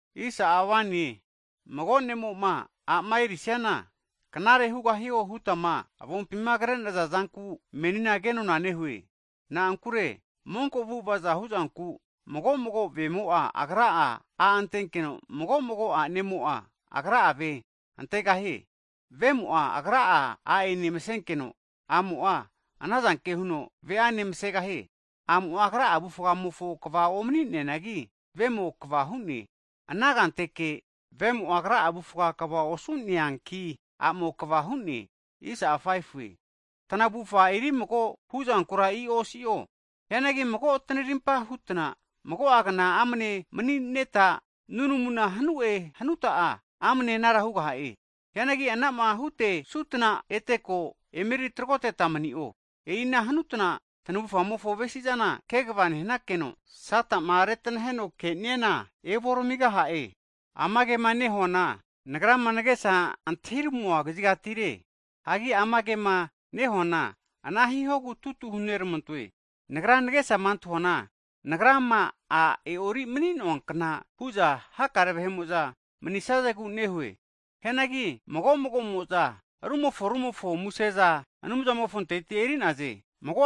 Hagi mago ne'mo'ma a'ma e'orisiana knare hugahio hutma avompima kre'naza zanku, menina kenona nehue. Na'ankure monko avu'ava'za hu'zanku, mago mago vemo'a agra'a, a' antenkeno, mago mago a'nemo'a agra'a ve antegahie. Vemo'a agra'a a'ene masenkeno, a'mo'a anazanke huno ve'ane masegahie. A'mo'a agra'a avufgamofo kva omani'neanagi vemo kva hu'ne. Ana hukna huno vemo'a agra'a avufga kva osu'neanki, a'amo kva hu'ne. Tanavufa eri mago huzankura i'o osi'o. Hianagi mago tanarimpa hutna mago'a kna amne mani'neta, nunamu hanu'e hanuta'a, amne anara hugaha'e. Hianagi anama hutesutna ete ko eme tragoteta mani'o. E'i ana hutna tanavufamofo avesizana kegava nehnakeno, Sata'ma reranaheno ke'niana, evu oramigaha'e. Amagema nehuana nagrama nagesa antahiramua kazigatire, hagi ama kema nehuana ana hihogu tutu hunormantoe. Nagra nagesama antahuana, nagrama a' e'ori manuankna hu'za hakare vahe'mo'za manisazegu nehue. Hianagi mago mago'mo'za rumofo rumofo museza Anumzamofonpintira eri'naze.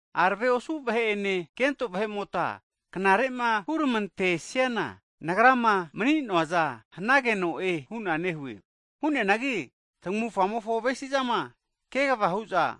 Arave osu vahe'ene, kento vahe'mota knare'ma hurmantesiana, nagrama mani'noaza huta manisazana knare hugahie. Hu'neanagi tamavufamofo avesizama kvama hu'za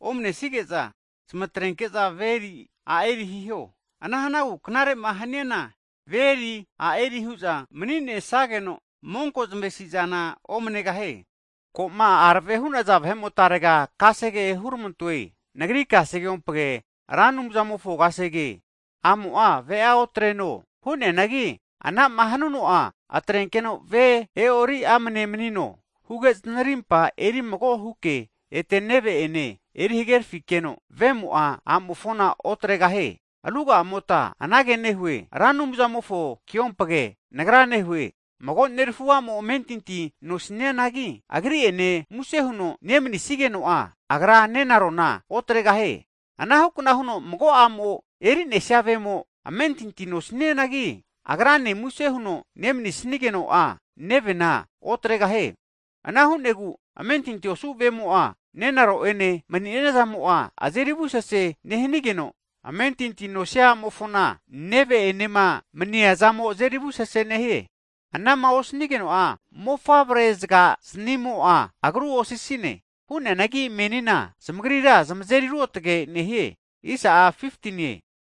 omne'nesige'za, zamatrenke'za ve eri, a' eri hiho. Ana hanagu knare'ma haniana ve eri, a' eri hu'za mani'nesageno monkozamofo zamavesi'zana omanegahie. Hagi ko'ma arave hu'naza vahe'motarega kasege huneramantoe, nagri kasegeompage Ra Anumzamofo kasege. A'mo'a ve'a otreno. (Hu'neanagi anama hanuno'a, atrenkeno ve e'ori amne manino, huge zanarimpa eri mago huke, ete neve'ene, eri hagerafikeno), vemo'a a'amofona otregahie. Hagi ruga'amotagura anage nehue, Ra Anumzamofo keompage nagra nehue, mago neramafu a'mo amentinti nosnianagi, agri ene muse huno neminsigeno'a, agra nenarona otregahie. Anahukna huno mago a'mo eri'nesia vemo, amentinti nosnianagi, agrane muse huno neminsigeno'a, nevena otregahie. Ana hu'negu amentinti osu ve'mo'a, nenaro'ene maniazamo azeri avusesea nehigeno, amentinti nosia a'mofona neve enema maniazamo, azeri avusesea nehie. Ana'ma osnigeno'a mofavre zagazniamo'a agrua osisine. Hu'neanagi menina zamagrira zamazeri ruotge nehie.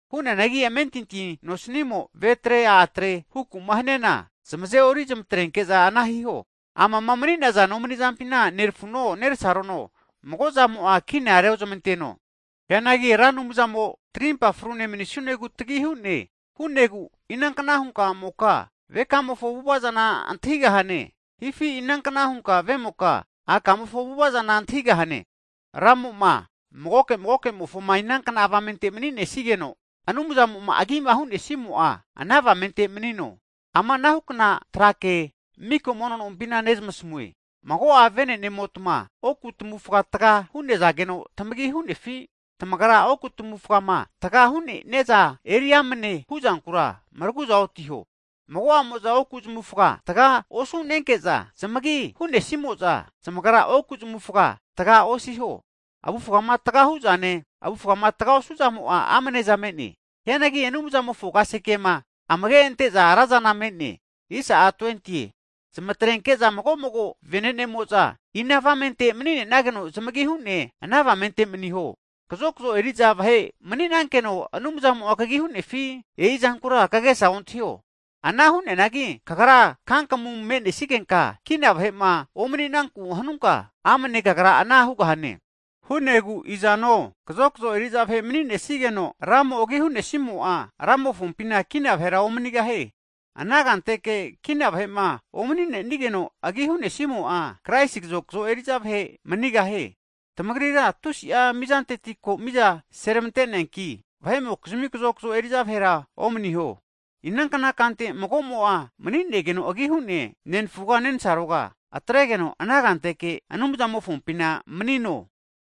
Hu'neanagi amentinti nosanimo ve atre, a' atre hukuma haniana, zamaze'ori zmatrenke'za ana hiho, amama mani'naza nomani'zampina nerafuno, neresarono mago'zamo'a kina reozmanteno. Hianagi tarimpa frune manisunegu, Ra Anumzamo'a tagi hu'ne. Hu'negu inankna hunka a'moka, vekamofo avu'ava'zana antahigahane? Hifi inankna hunka vemoka, akamofo avu'ava'zana antahigahane? Hagi Ra Anumzamo'a magoke magoke'mofoma inankna avamente mani'nesigeno, Anumzamo'ma agima hu'nesimo'a, ana avamente manino. Ama anahukna tra ke miko mono nompina nezamasamue. Mago'a vene'nemotma oku tmavufa taga hu'nazageno tamagi hu'nenigetma, tamagra oku tamufgama taga hu'neaza eriso'e hu'zankura maragu'za otiho. Mago'amo'za oku zamufga taga osu'nesage'za, zamagi hu'nesimo'za zamagra oku zamufga taga osiho. Avufgama taga hu'zane, avufgama taga osu'zamo'a amane'za me'ne. Hianagi Anumzamofo kasegema amage ante'zamo razana me'ne. Zamatrenke'za mago mago vene'nemo'za ina avamente mani'nageno zamagi hu'ne, ana avamenteke maniho. Kazokzo eri'za vahe mani'nankeno, Anumzamo'a kagi hu'nefi? E'i zankura kagesa ontahio. Ana hu'neanagi kagrama kankamu me'nesigenka kina vahe'ma omaninaku'ma hanunka, amne kagra anara hugahane. Hu'negu izano, kazokzo eri'za vahe mani'nesigeno, Ramo'ma agi hu'nesimo'a, Ramofompina kina vahera omanigahie. Ana kanteke kina vahe'ma omani'nenigeno agi hunesimo'a, Kraisi kazakzo eri'za vahe manigahie. Tamagrira tusi'a mizanteti ko miza seramante'neanki, vahe'mokizmi kazokzo eri'za vahera omaniho. Inankna kante mago'mo'a mani'negeno agi hu'ne, nenfuga nensaroga, atregeno ana kante Anumzamofompina manino.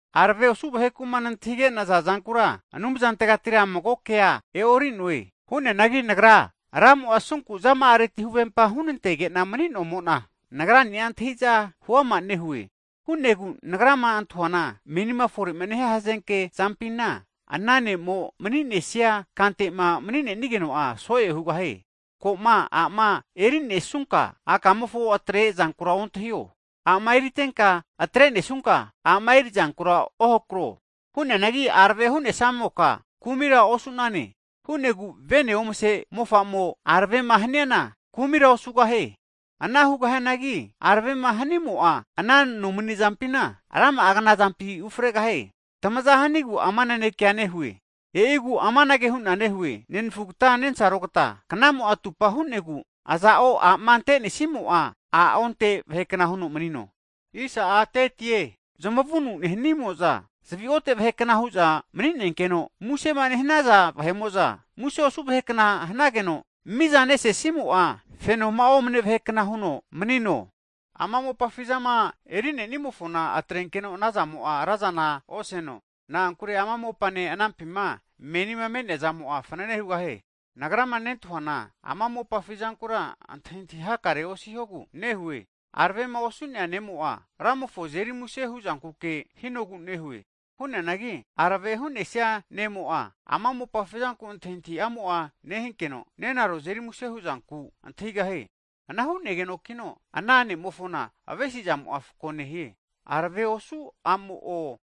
Arave osu vaheku'ma nantahige'naza zankura Anumzantegatira mago kasegea e'ori'noe. Hu'neanagi nagrira Ramo'a asunku zama'areti huvempa hunantege'na mani'nomo'na, nagrani'a antahi'za huama nehue. Hu'negu nagrama antahuana, menima fore nehia hazenke'zampina, ana ne'mo mani'nesia kante'ma mani'nigeno'a, so'e hugahie. Ko'ma, a'ma eri'nesunka, a'kamofo atre zankura ontahio. A'ma eritenka atrenesunka, a'ma erizankura ohakro. Hu'neanagi arave hu'nesamoka, kumira osu'nane. Hu'negu vene omase mofa'mo aravema haniana, kumira osugahie. Ana hugahianagi, aravema hanimo'a ana nomanizampina rama'a knazampi ufregahie. Tamaza hanigu ama nanekea nehue. E'igu amanage hu'na nehue, nenfugata nensarogata, knamo'a atupa hu'negu, aza'o a'ma antenesimo'a, a' onte vahekna huno manino. Zamavunu nehanimo'za zavi ote vahekna hu'za maninkeno, musema nehanaza vahe'mo'za muse osu vahe kna hanageno, fenoma mizanesesimo'a, fenoma'a omane vahe kna huno manino. Ama mopafi zama eri'nenimofona atrenkeno anazamo'a razana oseno. Na'ankure ama mopane anampima menima me'neazamo'a, fanene hugahie. Nagrama nentahuana ama mopafi zankura antahintahi hakarea osihogu nehue. Aravema osu'nea ne'mo'a, Ramofonku antahintahi nehuno, Ramofo azeri muse huzankuke nehie. Hu'neanagi arave hu'nesia ne'mo'a, ama mopafi zanku antahintahi'amo'a nehigeno nenaro azeri muse huzanku nentahie. Ana hu'negenokino ana ne'mofona avesi'zamo'a fako nehie. Arave osu a'mo'o,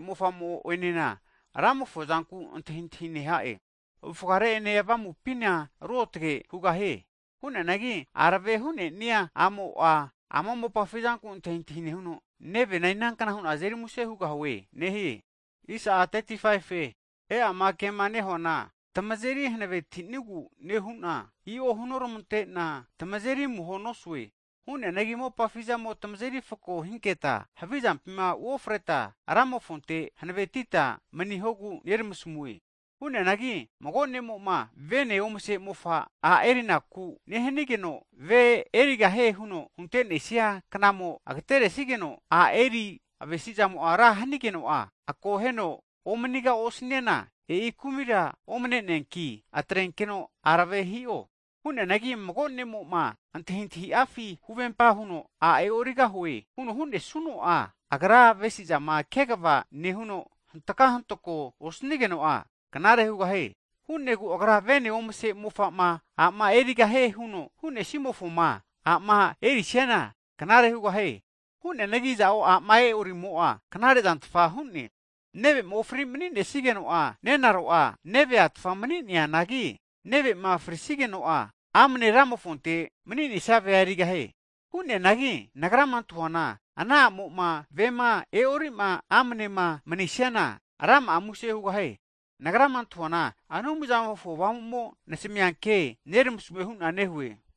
mofamo'enena Ramofo zanku antahintahi neha'e. Avufgare ene avamupina ruotage huno mani'zankuke nehie. Hu'neanagi arave hu'nenia a'mo'a, ama mopafi zanku antahintahi nehuno, nevena inankna hu'na azeri muse hugahue nehie. E'i ama ke'ma nehuana, tamagri'ma tamazeri hanavetinigu nehu'na, i'o hunoramante'na tamazeri amuho nosue. Hu'neanagi mopafizamo tamazeri fako hinketa, havizampina uofreta Ramofonte hanavetita manihogu neramasamue. Hianagi mago ne'mo'ma vene omase mofa a'erinaku'ma nehanigeno'a, ve erigahie huno huntenesia knamo agateresigeno, a'eri avesizamo'ma ra hanigeno'a, akoheno omaniga osaniana, e'i kumira omneneanki atrenkeno arave hino. Hu'neanagi mago ne'mo'ma antahintahi'afi huvempama huno, a' e'origahue huno hu'nesuno'a, agra avesizama kegava nehuno hantka hantako osnigeno'a knare hugahie. Hu'negu agra'a vene omase mofa'ma a'ma erigahie hu'nesimofoma a'ma erisiana knare hugahie. Hu'neanagi aza'o a'ma e'orimo'a knare zantfa hu'ne. Hagi neve'ma ofrino mani'nesigeno'a, nenaro'a neve a' tfa mani'neanangi, neve'ma frisigeno'a amane Ramofonte mani'nesia vea erigahie. Hu'neanagi nagrama antahuana, ana a'moma vema e'o'ri'ma amanema manisiana, rama'a muse hugahie. Nagrama antahuana Anumzamofo Avamu'mo nasamianke nermasamue hu'na nehue.